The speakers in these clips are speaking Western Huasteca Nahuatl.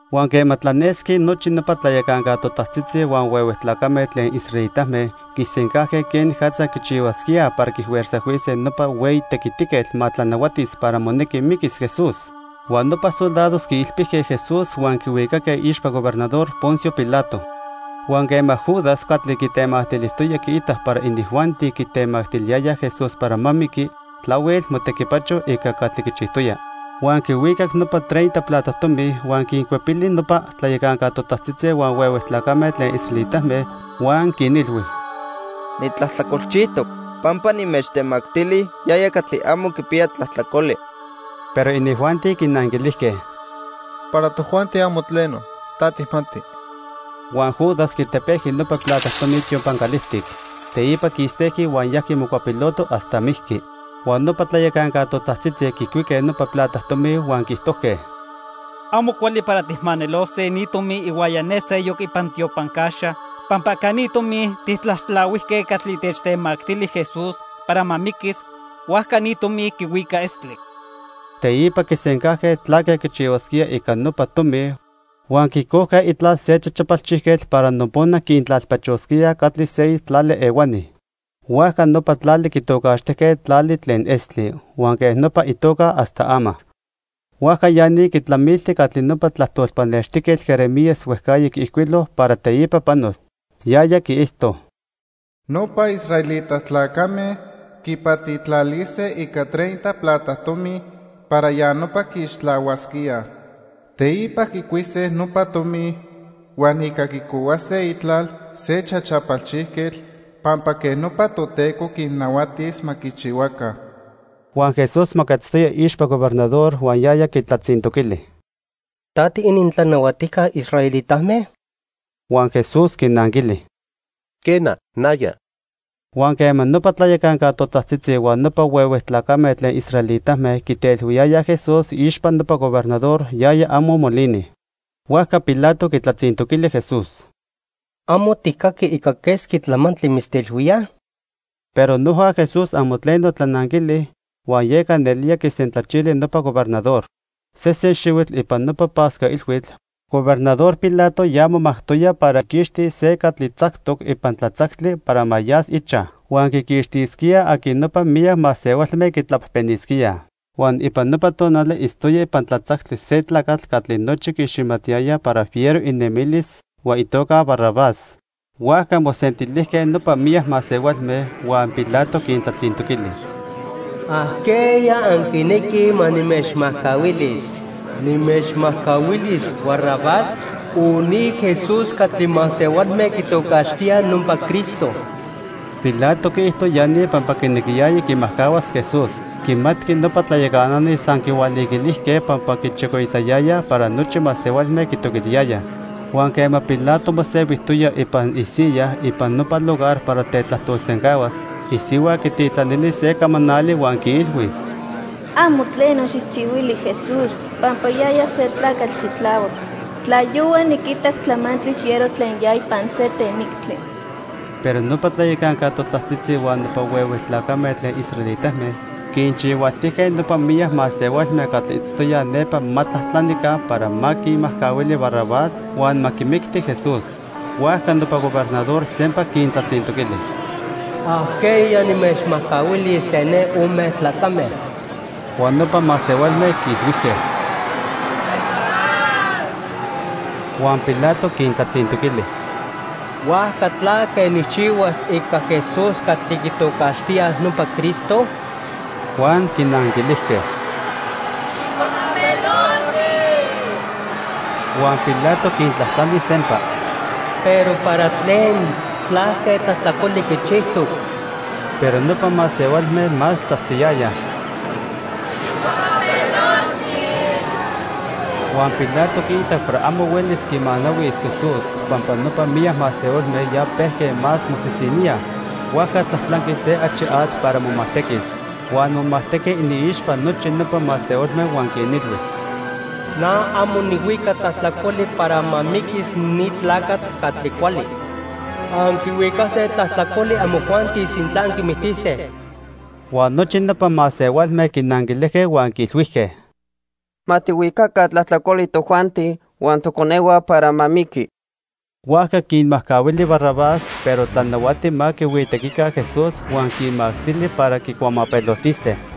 Huan quema tlanesqui, nochi nopa tlayacanca totajtzitzi huan huehue tlacame tlen israelitame quisencajque quenicatza quichihuasquíaj para quifuerzajhuise nopa hueyi tequitiquetl ma tlanahuatis para monequi miquis Jesús. Huan nopa soldados quiilpijque Jesús huan quihuicaque iixpa gobernador Poncio Pilato. Huan quema Judas catli quitemactilijtoya quiitac para inijuanti quitemactiliyayaj Jesús para ma miqui, tlahuel motequipacho ica catli quichijtoya. Huan quihuicac nopa treinta plata tomi, huan quincuepili nopa tlayacanca totajtzitzi huan huehue tlacame tlen israelitame, huan quinilhui: —Nitlajtlacolchijtoc pampa nimechtemactili yaya catli amo quipiya tlajtlacoli. Pero inijuanti quinanquilijque: —Para tojuanti amo tleno. Ta tijmati. Huan Judas quitepejqui nopa plata tomi tiopan calijtic. Teipa quistejqui huan yajqui mocuapiloto hasta mijqui. Huan nopa tlayacanca totajtzitzi quicuique nopa plata tomi huan quiijtojque: —Amo cuali para tijmanelose ni tomi ihuaya ne seyoc ipan tiopan caxa pampa ica ni tomi tijtlaxtlahuijque catli techtemactili Jesús para ma miquis, huajca ni tomi quihuica estli. Teipa quisencajque tlaque quichihuasquíaj ica nopa tomi huan quicojque itlal se chachapalchijquetl para nopona quintlalpachosquíaj catli seyoc tlali ehuani. Huajca nopa tlali quitocaxtijque Tlali tlen Estli. Huan quej nopa itoca hasta ama. Huajca ya ni quitlamilti catli nopa tlajtol pannextijquetl Jeremías huejcajya quiijcuilo para teipa panos. Yaya quiijto: "Nopa israelita tlacame quipatitlalise ica treinta plata tomi para ya nopa quiixtlahuasquíaj. Teipa quicuise nopa tomi huan ica quicohuase itlal se chachapalchijquetl pampa quej nopa Toteco quinnahuatis ma quichihuaca." Huan Jesús moquetztoya iixpa gobernador huan yaya quitlatzintoquili: —¿Ta tiinintlanahuatijca israelitame? Huan Jesús quinanquili: —Quena, naya. Huan quema nopa tlayacanca totajtzitzi huan nopa huehue tlacame tlen israelitame quitelhuiyayaj Jesús iixpa nopa gobernador, yaya amo molini. Huajca Pilato quitlatzintoquili Jesús: —¿Amo tijcaqui ica quesqui tlamantli mitztelhuíaj? Pero noja Jesús amo tleno tlananquili, huan yeca nelía quisentlachili nopa gobernador. Sesen xihuitl ipan nopa Pascua ilhuitl, Gobernador Pilato ya momajtoya para quiquixtis se catli tzactoc ipan tlatzactli para ma yas ichaj. Huan quiquixtisquía aqui nopa miyac masehualme quitlapejpenisquíaj. Huan ipan nopa tonali itztoya ipan tlatzactli se tlacatl catli nochi quiiximatiyayaj para fiero inemilis huan itoca Barrabás. Huajca mosentilijque nopa miyac masehualme, huan Pilato quintlatzintoquili: —¿Ajqueya anquinequij ma nimechmajcahuilis? ¿Nimechmajcahuilis Barrabás o ni Jesús catli masehualme quitocaxtíaj nopa Cristo? Pilato quiijto ya ni pampa quinequiyaya quimajcahuas Jesús. Quimatqui nopa tlayacanani san quihualiquilijque pampa quichicoitayayaj para nochi masehualme quitoquiliyayaj. Huan quema Pilato mosehuijtoya ipan isiya ipan nopa lugar para tetlajtolsencahuas, isihua quititlanili se camanali huan quiilhui: "Amo tleno xijchihuili Jesús pampa yaya se tlacatl xitlahuac. Tlayohua niquitac tlamantli fiero tlen ya ipan se temictli." Pero nopa tlayacanca totajtzitzi huan nopa huehue tlacame tlen israelitame quinchihualtijque nopa miyac masehualme catli itztoyaj nepa ma tlajtlanica para ma quinmajcahuili Barrabás huan ma quimicti Jesús. Huajca nopa gobernador sempa quintlatzintoquili: —¿Ajqueya nimechmajcahuilis tlen ne ome tlacame? Huan nopa masehualme quiilhuijque: —Barrabás. Huan Pilato quintlatzintoquili: —Huajca ¿tlaque nijchihuas ica Jesús catli quitocaxtíaj nopa Cristo? Huan quinanquilijque: —Xijcuamapelolti. Huan Pilato quintlajtlani sempa: —Pero ¿para tlen? ¿Tlaque tlajtlacoli quichijtoc? Pero nopa masehualme más tzajtziyayaj: —Xijcuamapelolti. Huan Pilato quiitac para amo huelis quimanahuis Jesús pampa nopa miyac masehualme ya pejque más mosisiníaj. Huajca tlajtlanqui se achi atl para momajtequis. Huan momajtequi iniixpa nochi nopa masehualme huan quinilhui: —Na amo nijhuica tlajtlacoli para ma miquis ni tlacatl catli cuali. Anquihuicase tlajtlacoli amojuanti sintla anquimictise. Huan nochi nopa masehualme quinanquilijque huan quiilhuijque: —Ma tijhuicaca tlajtlacoli tojuanti huan toconehua para ma miqui. Huajca quinmajcahuili Barrabás, pero tlanahuati ma quihuitequica Jesús huan quinmactili para quicuamapeloltise.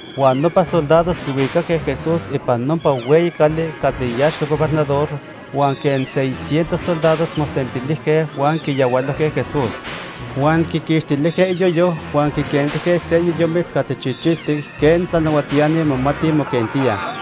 Huan nopa soldados quihuicaque Jesús ipan nopa hueyi cali catli iaxca gobernador, huan quen seiscientos soldados mosentilijque huan quiyahualojque Jesús. Huan quiquixtilijque iyoyo huan quiquentijque se yoyomitl catli chichiltic quen tlanahuatiani momatij moquentíaj.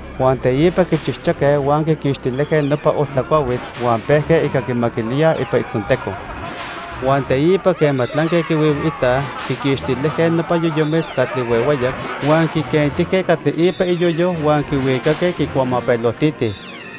Huan teipa quichijchaque huan quiquixtilijque nopa ojtla cuahuitl huan pejque ica quimaquilíaj ipan itzonteco. Huan teipa quema tlanque quihuihuiitaj, quiquixtilijque nopa yoyomitl catli huehueyac huan quiquentijque catli ipa iyoyo huan quihuicaque quicuamapeloltitij.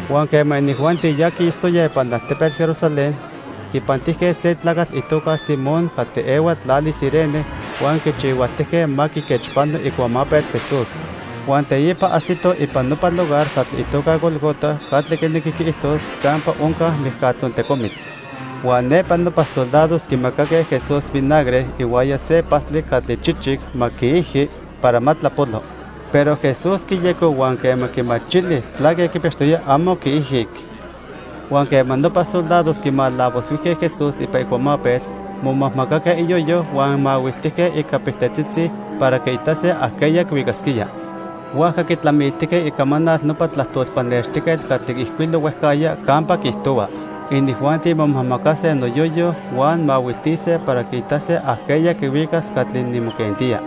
Huan quema inijuanti ya quistoyaj ipan altepetl Jerusalén, quipantijque se tlacatl itoca Simón catli ehua tlali Cirene huan quichihualtijque ma quiquechpano icuamapel Jesús. Huan teipa ajsitoj ipan nopa lugar catli itoca Gólgota (catli quinequi quiijtos "Campa Onca Mijcatzontecomitl"). Huan nepa nopa soldados quimacaque Jesús vinagre ihuaya se pajtli catli chichic ma quiiji para ma tlapolo. Pero Jesús quiyeco huan quema quimachili tlaque quipixtoya, amo quiijic. Huan quema nopa soldados quimalavoshuijque Jesús ipan icuamapel, momajmacaque iyoyo huan mahuiltijque ica piltetzitzi para quiitase ajqueya quihuicasquía. Huajca quitlamiltijque icamanal nopa tlajtol pannextijquetl catli quiijcuilo huejcajya campa quiijtohua: "Inijuanti momajmacase noyoyo huan mahuiltise para quiitase ajqueya quihuicas catli nimoquentía."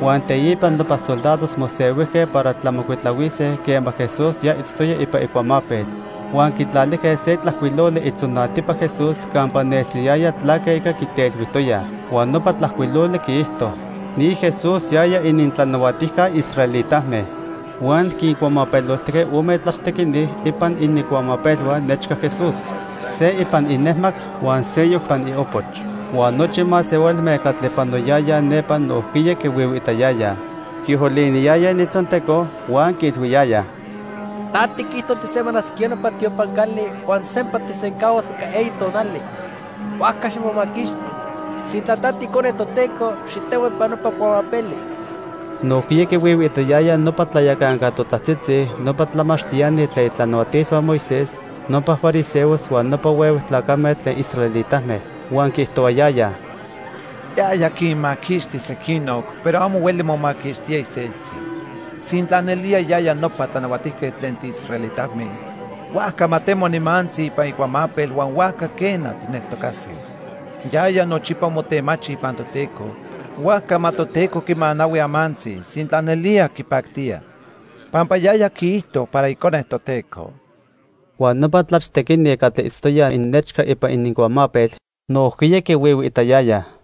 Huan teipa nopa soldados mosehuijque para tlamocuitlahuise quema Jesús ya itztoya ipan icuamapel. Huan quitlalijque se tlajcuiloli itzonatipa Jesús campa nesiyaya tlaque ica quitelhuijtoyaj. Huan nopa tlajcuiloli quiijto:|sc NI JES'US, YAYA ININTLANAHUATIJCA ISRAELITAME|r. Huan quincuamapeloltijque ome tlachtequini ipan inincuamapelhua nechca Jesús. Se ipan inejmac huan seyoc ipan iopoch. Huan nochi masehualme catli panoyayaj nepa nojquiya quihuihuiitayayaj. Quiojoliniyayaj inintzonteco, huan quiilhuiyayaj: —Ta tiquijto tijsemanasquía nopa tiopan cali huan sempa tijsencahuas ica eyi tonali. Huajca ximomaquixti. Sintla ta tiIcone Toteco, xitemo ipan nopa cuamapeli. Nojquiya quihuihuiitayayaj nopa tlayacanca totajtzitzi, nopa tlamachtiani tlen itlanahuatilhua Moisés, nopa fariseos huan nopa huehue tlacame tlen israelitame. Huan quiijtohuayayaj: —Yaya quinmaquixti sequinoc pero amo hueli momaquixtía iseltzi. Sintla nelía yaya nopa tlanahuatijquetl tlen tiisraelitame, huajca ma temo nimantzi ipan icuamapel huan huajca, quena, tijneltocase. Yaya nochipa motemachi ipan Toteco, huajca ma Toteco quimanahui amantzi, sintla nelía quipactía. Pampa yaya quiijto para Icone Toteco. Huan nopa tlachtequini catli itztoyaj inechca ipan inincuamapel, nojquiya quihuihuiitayayaj.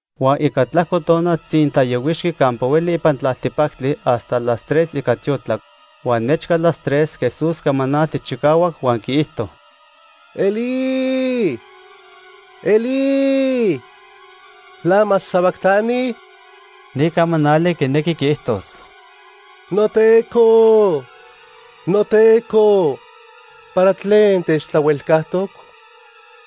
Huan ica tlajco tona tzintlayohuixqui campa hueli ipan tlaltipactli hasta las tres ica tiotlac. Huan nechca las tres Jesús camanaltic chicahuac huan quiijto: "Elí, Elí, ¿lama sabactani?" Ni camanali quinequi quiijtos: "NoTeco, noTeco, ¿para tlen techtlahuelcajtoc?"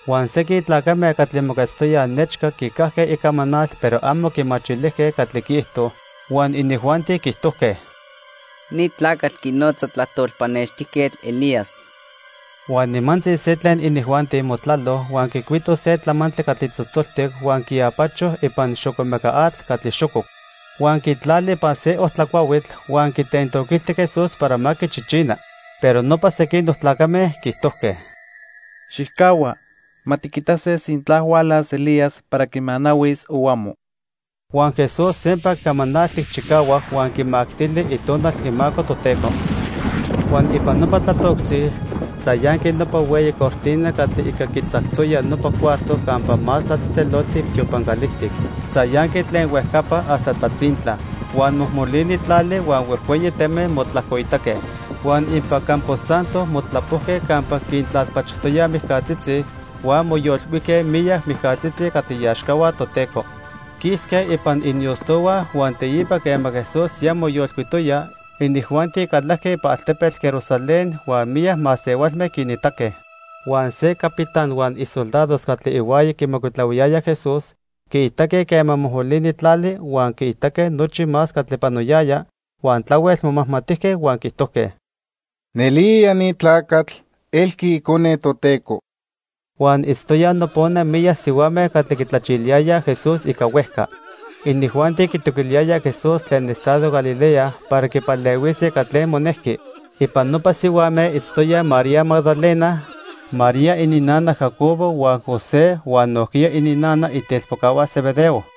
Huan sequin tlacame catli moquetztoyaj nechca quicajque icamanal pero amo quimachilijque catli quiijto, huan inijuanti quiijtojque: —Ni tlacatl quinotza tlajtol pannextijquetl Elías. Huan nimantzi se tlen inijuanti motlalo, huan quicuito se tlamantli catli tzotzoltic huan quiapacho ipan xocomeca atl catli xococ. Huan quitlali ipan se ojtla cuahuitl huan quitentoquilti Jesús para ma quichichina. Pero nopa sequinoc tlacame quiijtojque: —Xijcahua. Ma tiquitase sintla hualas Elías para quimanahuis o amo. Huan Jesús sempa camanaltic chicahuac huan quimactili Itonal imaco Toteco. Huan ipan nopa tlatoctzi, tzayanqui nopa hueyi cortina catli ica quitzactoya nopa cuarto campa Más Tlatzejtzeloltic tiopan calijtic. Tzayanqui tlen huejcapa hasta tlatzintla. Huan mojmolini tlali huan huejhueyi teme motlajcoitaque. Huan ipan campo santo motlapojque campa quintlalpachojtoyaj mijcatzitzi huan moyolcuique miyac mijcatzitzi catli iaxcahua Toteco. Quisque ipan iniostohua huan teipa quema Jesús ya moyolcuitoya, inijuanti calajque ipan altepetl Jerusalén huan miyac masehualme quinitaque. Huan se capitán huan isoldados catli ihuaya quimocuitlahuiyayaj Jesús quiitaque quema mojmolini tlali, huan quiitaque nochi más catli panoyaya, huan tlahuel momajmatijque huan quiijtojque: —Nelía ni tlacatl elqui Icone Toteco. Huan itztoyaj nopona miyac sihuame catli quitlachiliyayaj Jesús ica huejca. Inijuanti quitoquilijtoyaj Jesús tlen estado Galilea para quipalehuise ica tlen monejqui. Ipan nopa sihuame itztoyaj María Magdalena, María ininnana Jacobo huan José, huan nojquiya ininnana itelpocahua Zebedeo.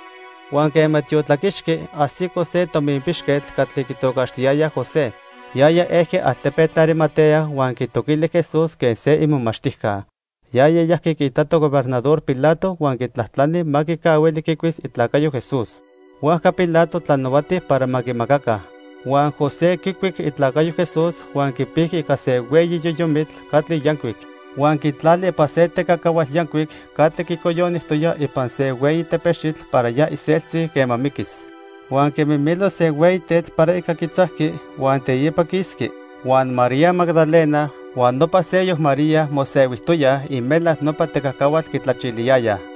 Huan quema tiotlaquixqui, ajsico se tominpixquetl catli quitocaxtiyayaj José. Yaya ejqui altepetl Arimatea huan quitoquili Jesús quen se imomachtijca. Yaya yajqui quiitato gobernador Pilato huan quitlajtlani ma quicahuili quicuis itlacayo Jesús. Huajca Pilato tlanahuati para ma quimacaca. Huan José quicuic itlacayo Jesús huan quipijqui ica se hueyi yoyomitl catli yancuic. Huan quitlali ipan se tecacahuatl yancuic catli quicoyonijtoya ipan se hueyi tepexitl para ya iseltzi quema miquis. Huan quimimilo se hueyi tetl para ica quitzajqui, huan teipa quisqui. Huan María Magdalena huan nopa seyoc María mosehuijtoyaj imelac nopa tecacahuatl quitlachiliyayaj.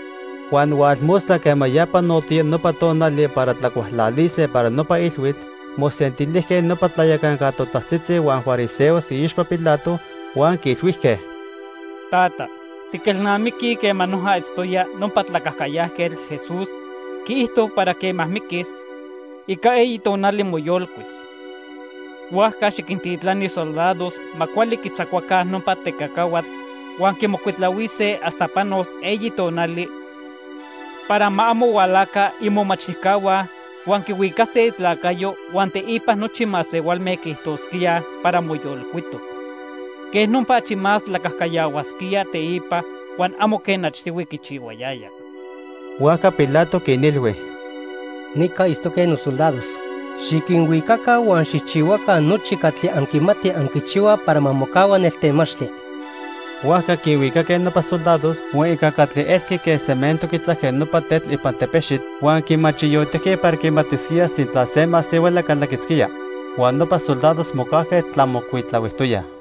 Huan hualmostla quema ya panotoya nopa tonali para tlacualtlalise para nopa ilhuitl, mosentilijque nopa tlayacanca totajtzitzi huan fariseos iixpa Pilato, huan quiilhuijque: —Tata, tiquelnamiquij quema noja itztoya, nopa tlacajcayajquetl, Jesús, quiijto para quema miquis, ica eyi tonali moyolcuis. Huajca xiquintitlani soldados ma cuali quitzacuaca nopa tecacahuatl huan quimocuitlahuise hasta panos eyi tonali para ma amo hualaca imomachtijcahua huan quihuicase itlacayo huan teipa nochi masehualme quiijtosquíaj para moyolcuitoc. Quej nopa achi más tlacajcayahuasquía teipa, huan amo quen achtihui quichihuayaya. Huajca Pilato quinilhui: —Nica itztoque nosoldados. Xiquinhuicaca huan xijchihuaca nochi catli anquimatij anquichihuaj para ma mocahua neltemachtli. Huajca quinhuicaque nopa soldados huan ica catli elqui quen cemento quitzajque nopa tetl ipan tepexitl huan quimachiyojtijque para quimatisquíaj sintla se masehuali calaquisquía. Huan nopa soldados mocajque tlamocuitlahuijtoyaj.